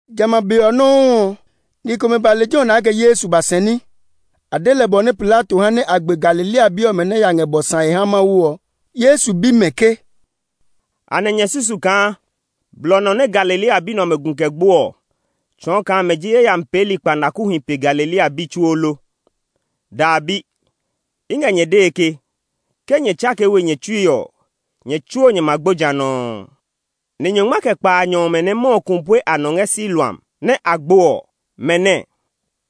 Jamɛ a be ɔ nɔuu ɔ, ni komɛ ba lejɛ ɔ nɛ a kɛ Yesu ba sɛɛ ní. A de lɛ bɔ nɛ Pilato ha nɛ a gbe Galilea bi ɔmɛ nɛ ya ngɛ bɔ sãe ha Mawu ɔ. Yesu bi mɛ ke, “Anɛ nyɛ susu kaa blɔ nɔ nɛ Galilea bi nɛ ɔmɛ gu kɛ gbo ɔ tsɔɔ kaa mɛ ji yayami peeli kpanakuhi pe Galilea bi tsuo lo? Dɛbi! I ngɛ nyɛ dee ke, ke nyɛ tsakee we nyɛ tsui ɔ, nyɛ tsuo nyɛ ma gbo ja nɔuu. Ni nyɔngma kɛ kpaanyɔ ɔmɛ nɛ mɔ ɔ ku pue a nɔ ngɛ Siloam nɛ a gbo ɔ, mɛ nɛɛ?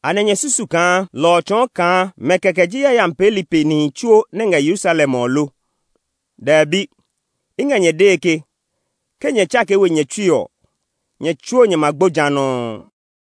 Anɛ nyɛ susu kaa lɔ ɔ tsɔɔ kaa mɛ kɛkɛ ji yayami peeli pe nihi tsuo nɛ ngɛ Yerusalem ɔ lo? Dɛbi! I ngɛ nyɛ dee ke, ke nyɛ tsakee we nyɛ tsui ɔ, nyɛ tsuo nyɛ ma gbo ja nɔuu.”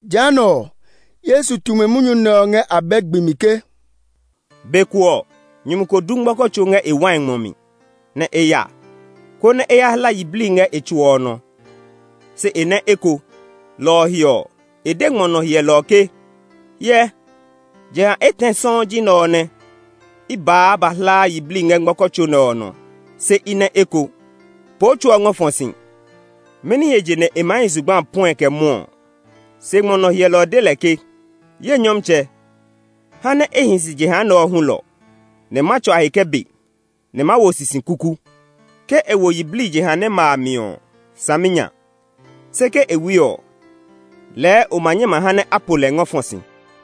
Jehanɛ ɔ, Yesu tu mɛ munyu nɛ ɔ ngɛ abɛ gbi mi ke, “Be ko ɔ, nyumu ko du ngmɔkɔ tso ngɛ e wai ngmɔ mi, nɛ e ya, konɛ e ya hla yiblii ngɛ tso ɔ nɔ, se e nɛ eko. Lɔ ɔ he ɔ, e de e ngmɔ nɔ hyɛlɔ ɔ ke, ‘Hyɛ, jeha etɛ sɔuu ji nɛ ɔ nɛ i baa ba hlaa yiblii ngɛ ngmɔkɔ tso nɛ ɔ nɔ, se i nɛ eko. Poo tso ɔ ngɔ fɔ si! Mɛni he je nɛ e maa hi zugba a puɛe kɛ mwɔɔ ɔ?’ Se ngmɔ nɔ hyɛlɔ ɔ de lɛ ke, ‘Ye nyɔmtsɛ, ha nɛ e hi si jeha nɛ ɔ hulɔ; nɛ ma tsua he kɛ be, nɛ ma wo sisi kuku. Ke e wo yiblii jeha nɛ ma a mi ɔ, saminya. Se ke e wui ɔ, lɛɛ o ma nyɛ ma ha nɛ a po lɛ ngɔ fɔ si.’”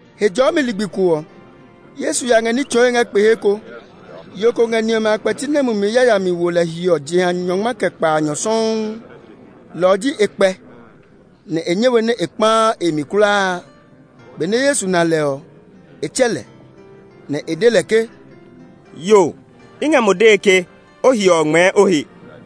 Hejɔɔmi ligbi ko ɔ, Yesu ya ngɛ ní tsɔɔe ngɛ kpe he ko. Yo ko ngɛ ni ɔmɛ a kpɛti nɛ mumi yayami wo lɛ hiɔ jeha nyɔngma kɛ kpaanyɔ sɔuu; lɔ ɔ ji e kpɛ, nɛ e nyɛ we nɛ e kpãã e mi kulaa. Benɛ Yesu na lɛ ɔ, e tsɛ lɛ, nɛ e de lɛ ke, “Yo, i ngɛ mo dee ke o hiɔ ɔ ngmɛɛ o he!”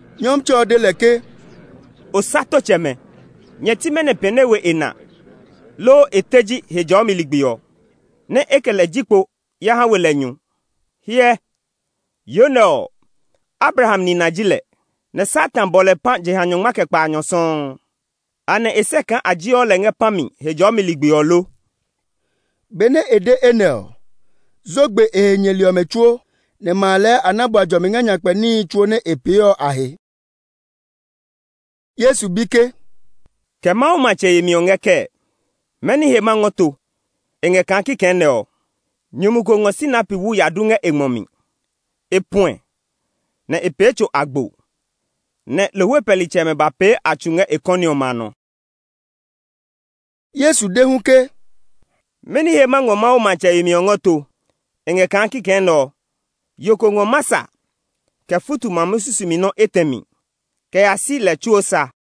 Nyɔmtsɛ ɔ de lɛ ke, “Osatotsɛmɛ! Nyɛ ti mɛnɔ pɛne we e na, loo e teji Hejɔɔmi ligbi ɔ, nɛ e kɛ lɛ ji kpo ya ha we lɛ nyu? Hyɛ, yo nɛ ɔ, Abraham nina ji lɛ, nɛ Satan bɔ lɛ pã jeha nyɔngma kɛ kpaanyɔ sɔuu. Anɛ e sɛ kaa a jeɔ lɛ ngɛ pã mi Hejɔɔmi ligbi ɔ lo?” Benɛ e de enɛ ɔ, zo gbe e he nyɛli ɔmɛ tsuo, nɛ ma a lɛɛ a na bua jɔmi ngɛ nyakpɛ níhi tsuo nɛ e pee ɔ a he. Yesu bi ke, “Kɛ Mawu matsɛ yemi ɔ ngɛ kɛɛ? Mɛni he ma ngɔ to? E ngɛ kaa kikɛ nɛ ɔ. Nyumu ko ngɔ sinapi wu ya du ngɛ e ngmɔ mi. E puɛ, nɛ e pee tso agbo, nɛ lohwe pɛlitsɛmɛ ba pee a tsu ngɛ e kɔni ɔmɛ a nɔ.” Yesu de hu ke, “Mɛni he ma ngɔ Mawu matsɛ yemi ɔ ngɔ to? E ngɛ kaa kikɛ nɛ ɔ. Yo ko ngɔ masa kɛ futu mamu susumi nɔ́ etɛ mi kɛ ya si lɛ tsuo sa.”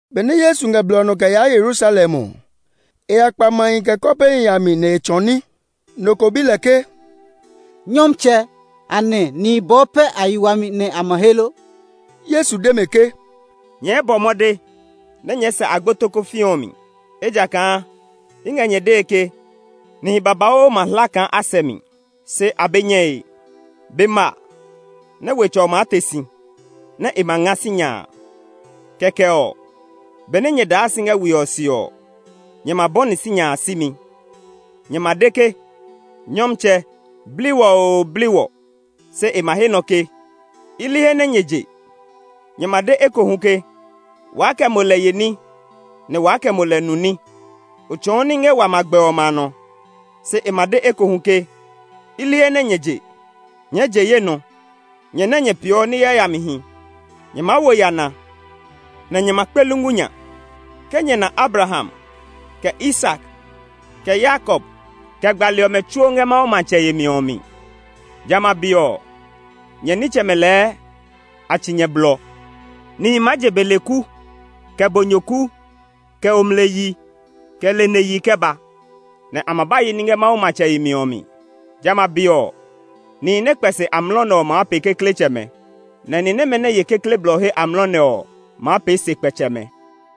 Benɛ Yesu ngɛ blɔ ɔ nɔ kɛ yaa Yerusalem ɔ, e ya kpa mahi kɛ kɔpehi a mi nɛ e tsɔɔ ní. Nɔ ko bi lɛ ke, “Nyɔmtsɛ, anɛ nihi bɔɔ pɛ a yi wami nɛ a ma he lo?” Yesu de mɛ ke, “Nyɛɛ bɔ mɔde nɛ nyɛɛ sɛ agbo tokofii ɔ mi. Ejakaa, i ngɛ nyɛ dee ke, nihi babauu ma hla kaa a sɛ mi, se a be nyɛe. Be ma nɛ wetsɛ ɔ maa te si, nɛ e ma nga sinya a. Kɛkɛ ɔ, benɛ nyɛ daa si ngɛ we ɔ se ɔ, nyɛ ma bɔni sinya a simi. Nyɛ ma de ke, ‘Nyɔmtsɛ, bli wɔ oo, bli wɔ!’ Se e ma he nɔ ke, ‘I li he nɛ nyɛ je!’ Nyɛ ma de ekohu ke, ‘Waa kɛ mo lɛ ye ní, nɛ waa kɛ mo lɛ nu ní; o tsɔɔ ní ngɛ wa magbɛ ɔmɛ a nɔ.’ Se e ma de ekohu ke, ‘I li he nɛ nyɛ je! Nyɛɛ je ye nɔ, nyɛ nɛ nyɛ peeɔ ní yayamihi!’ Nyɛ maa wo yana, nɛ nyɛ ma kpe lungu nya, ke nyɛ na Abraham kɛ Isak, kɛ Yakob, kɛ gbali ɔmɛ tsuo ngɛ Mawu matsɛ yemi ɔ mi. Jamɛ a be ɔ, nyɛ nitsɛmɛ lɛɛ a tsi nyɛ blɔ! Nihi maa je beleku, kɛ bonyoku, kɛ omleyi, kɛ leneyi kɛ ba, nɛ a ma ba ye ní ngɛ Mawu matsɛ yemi ɔ mi. Jamɛ a be ɔ, nihi nɛ kpɛ se amlɔ nɛ ɔ maa pee kekletsɛmɛ, nɛ ni nɛmɛ nɛ ye kekle blɔ he amlɔ nɛ ɔ maa pee sekpɛtsɛmɛ.”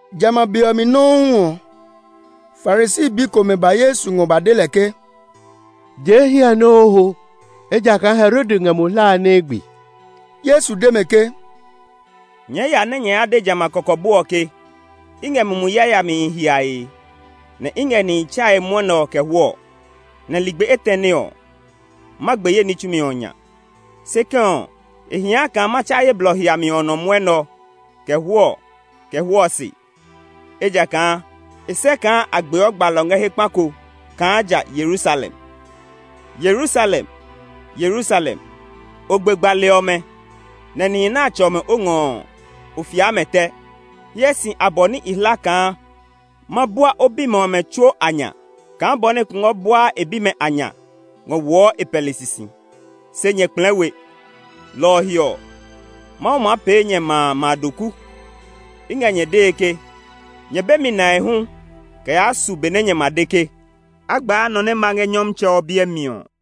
Jamɛ a be ɔ mi nɔuu ɔ, Farisi bi komɛ ba Yesu ngɔ ba de lɛ ke, “Jee hiɛ ɔ nɛ o ho; ejakaa Herode ngɛ mo hlae nɛ e gbe.” Yesu de mɛ ke, “Nyɛɛ ya nɛ nyɛ ya de jamɛ a kɔkɔbo ɔ ke, ‘I ngɛ mumi yayamihi hiae, nɛ i ngɛ nihi tsae mwɔnɛ ɔ kɛ hwɔɔ, nɛ ligbi etɛne ɔ, ma gbe ye ní tsumi ɔ nya.’ Se kɛ̃ ɔ, e hia kaa ma tsa ye blɔ hiami ɔ nɔ mwɔnɛ ɔ, kɛ hwɔɔ, kɛ hwɔɔ se; ejakaa e sɛ kaa a gbeɔ gbalɔ ngɛ he kpa ko kaa ja Yerusalem. “Yerusalem Yerusalem! O gbe gbali ɔmɛ, nɛ nihi nɛ a tsɔ mɛ o ngɔ ɔ, o fia mɛ tɛ! Hyɛ si abɔ nɛ i hla kaa ma bua o bimɛ ɔmɛ tsuo a nya kaa bɔ nɛ kungwɔ buaa e bimɛ a nya ngɔ woɔ e pɛli sisi; se nyɛ kplɛɛ we! Lɔ ɔ he ɔ, Mawu maa pee nyɛ ma a ma doku. I ngɛ nyɛ dee ke, nyɛ be mi nae hu kɛ yaa su be nɛ nyɛ ma de ke, ‘A gbaa nɔ nɛ ma ngɛ Nyɔmtsɛ ɔ biɛ mi ɔ!’”